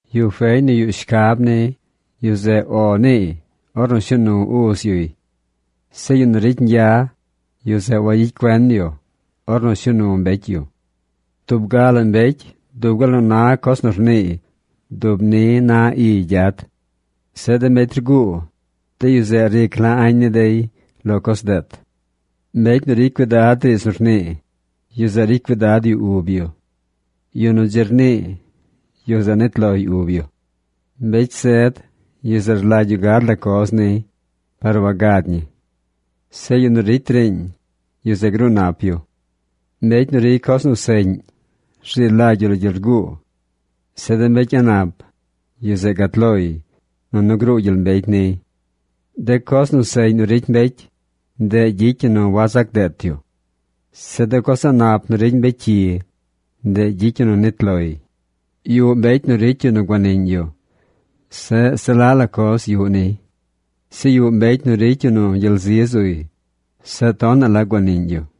Yu feñ nu yuꞌ shcab ni, yu zeꞌ “O”, niiy ornu shuu nu uz yuy. Zeꞌ yu nu ricy ñgya, yu zeꞌ wagyicy cuen yu ornu shuu nu mbecy yu. Tub ga la mbecy dub gal nu na coz nu rniiy dub ni na iy gyad. Zeꞌ de mbecy rguu, de yu zeꞌ ric la añ ni dey lo coz deet. Mbecy nu ricy cuidad riidz nu rnii, yu zeꞌ ricy cuidad yu ub yu. Yu nu dzi rnii, yu zeꞌ nit loy ub yu. Mbecy zed, yu zeꞌ rlagy yu gad la coz niy, par wagad ñi. Zeꞌ yu nu ricy riiñ, yu zeꞌ gruu nap yu. Mbecy nu ricy coz nu seꞌñ rzi lagy yu lo gyel rguu. Zeꞌ de mbecy a̱ꞌ nap, yu zeꞌ gat loy, nunu gruu gyel mbecy niy. De coz nu seꞌñ nu ricy mbecy, ndeꞌ gyicy ñi nu wazac deet yu. Zeꞌ de coz a̱ꞌ nap nu ricy mbecy cyi, ndeꞌ gyicy ñi nu nit loy. Yuꞌ mbecy nu ricy yu nu guaniꞌñ yu, zeꞌ se la la coz yuꞌ niy. Zeꞌ yuꞌ mbecy nu ricy yu nu gyel zi zuy, zeꞌ tonaꞌ la guaniꞌñ yu.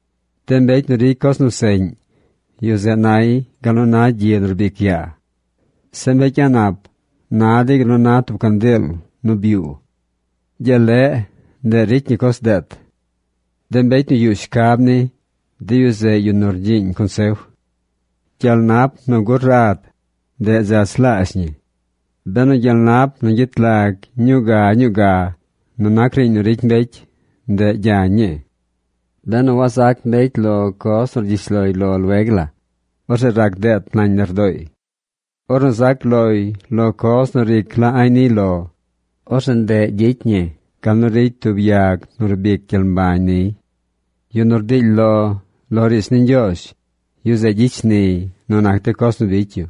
De mbecy nu ricy coz nu seꞌñ, yu zeꞌ nay gal nu na gyi nu rbic yaa. Zeꞌ mbecy a̱ꞌ nap na dey gal nu na tub candiil nu byuu. Gyel leꞌ, ndeꞌ ricy ñi coz deet. De mbecy nu yuꞌ shcab ni, de yu zeꞌ yu nu rgyiiñ consef. Gyel nap nu gur rad, ndeꞌ dzach laazh ñi. Benu gyel nap nu gyet lag ñuu ga ñuu ga nu nac riiñ nu ricy mbecy, ndeꞌ gyañ ñii. Benu wazac mbecy lo coz nu cyish loy lo lueg la, orzeꞌ rac deet nañ lardooy. Ornu zac loy lo coz nu ric la añ niy lo, orzeꞌ ndeꞌ ricy ñi gal nu ricy tub yag nu rbic gyel mbañ niy. Yu nu rdily lo lo riidz ni Ñgyoozh, yu zeꞌ gyicy shniy nu nac coz nu bicy yu.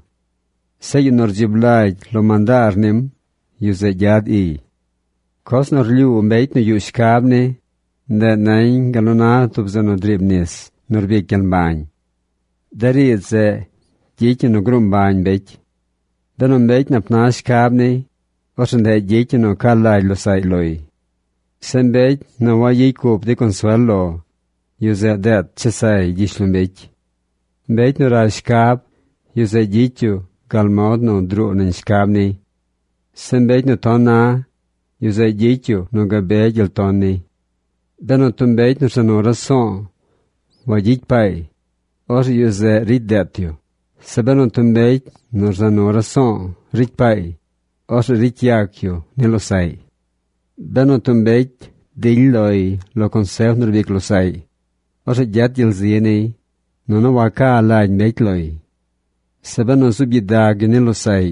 Zeꞌ yu nu rdzib lagy lo mandaar nim, yu zeꞌ gyad iy. Coz nu rlyuu mbecy nu yuꞌ shcab ni, ndeꞌ nañ gal nu na tub zeꞌ nu driib nis nu rbic gyel mbañ. De riidz zeꞌ gyicy ñi nu gruu mbañ mbecy. Benu mbecy nap na shcab niy, orzeꞌ ndeꞌ gyicy ñi nu ca lagy losaꞌy loy. Zeꞌ mbecy nu wayicy cup dey consuel lo, yu zeꞌ deet chesay gyishlombecy. Mbecy nu rash shcab, yu zeꞌ gyicy yu gal mod nu druu nañ shcab niy. Zeꞌ mbecy nu ton na, yu zeꞌ gyicy yu nu gabe gyel ton niy. Benu tub mbecy nu rza nu raso̱o̱ wagyicy paay, orzeꞌ yu zeꞌ ricy deet yu. Zeꞌ benu tub mbecy nu rza nu raso̱o̱ ricy paay, orzeꞌ ricy yac yu ni losaꞌy. Benu tub mbecy dily loy lo consef nu rbic losaꞌy, orzeꞌ gyet gyel zi niy, nunu waca lagy mbecy loy. Zeꞌ benu zuub gyidag yu ni losaꞌy,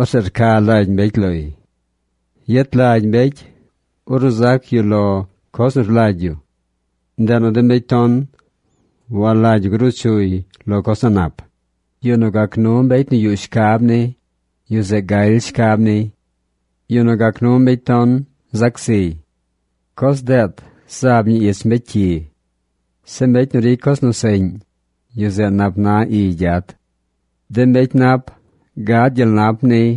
orzeꞌ rca lagy mbecy loy. Yet lagy mbecy ornu zac yu lo coz nu rlagy yu. Ndeꞌ nu de mbecy ton walagy yu gruu chuy lo coz a̱ꞌ nap. Yu nu gac nu mbecy nu yuꞌ shcab ni, yu zeꞌ galy shcab niy. Yu nu gac nu mbecy ton, zac ziy. Coz deet zaab ñi ich mbecy cyi. Zeꞌ mbecy nu ricy coz nu seꞌñ, yu zeꞌ nap na iy gyad. De mbecy nap gad gyel nap niy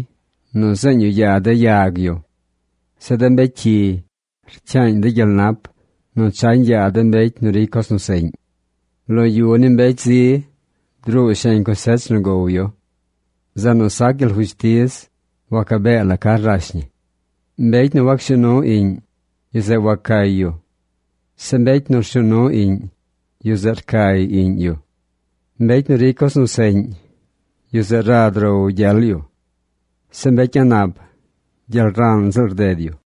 nu zeeñ yu yaa de yag yu. Zeꞌ de mbecy cyi rcyaañ dey gyel nap nu chañ yaa de mbecy nu ricy coz nu seꞌñ. Lo yu ni mbecy zi druu sheñ cosech nu gow yu. Zeꞌ nu sac gyel fushtiz, wacabee la ca rash ñi. Mbecy nu wacshuu nu iꞌñ, yu zeꞌ wacay yu. Zeꞌ mbecy nu rshuu nu iꞌñ, yu zeꞌ rcay iꞌñ yu. Mbecy nu ricy coz nu seꞌñ, yu zeꞌ rad row gyel yu. Zeꞌ mbecy a̱ꞌ nap gyel ran ziꞌl rded yu.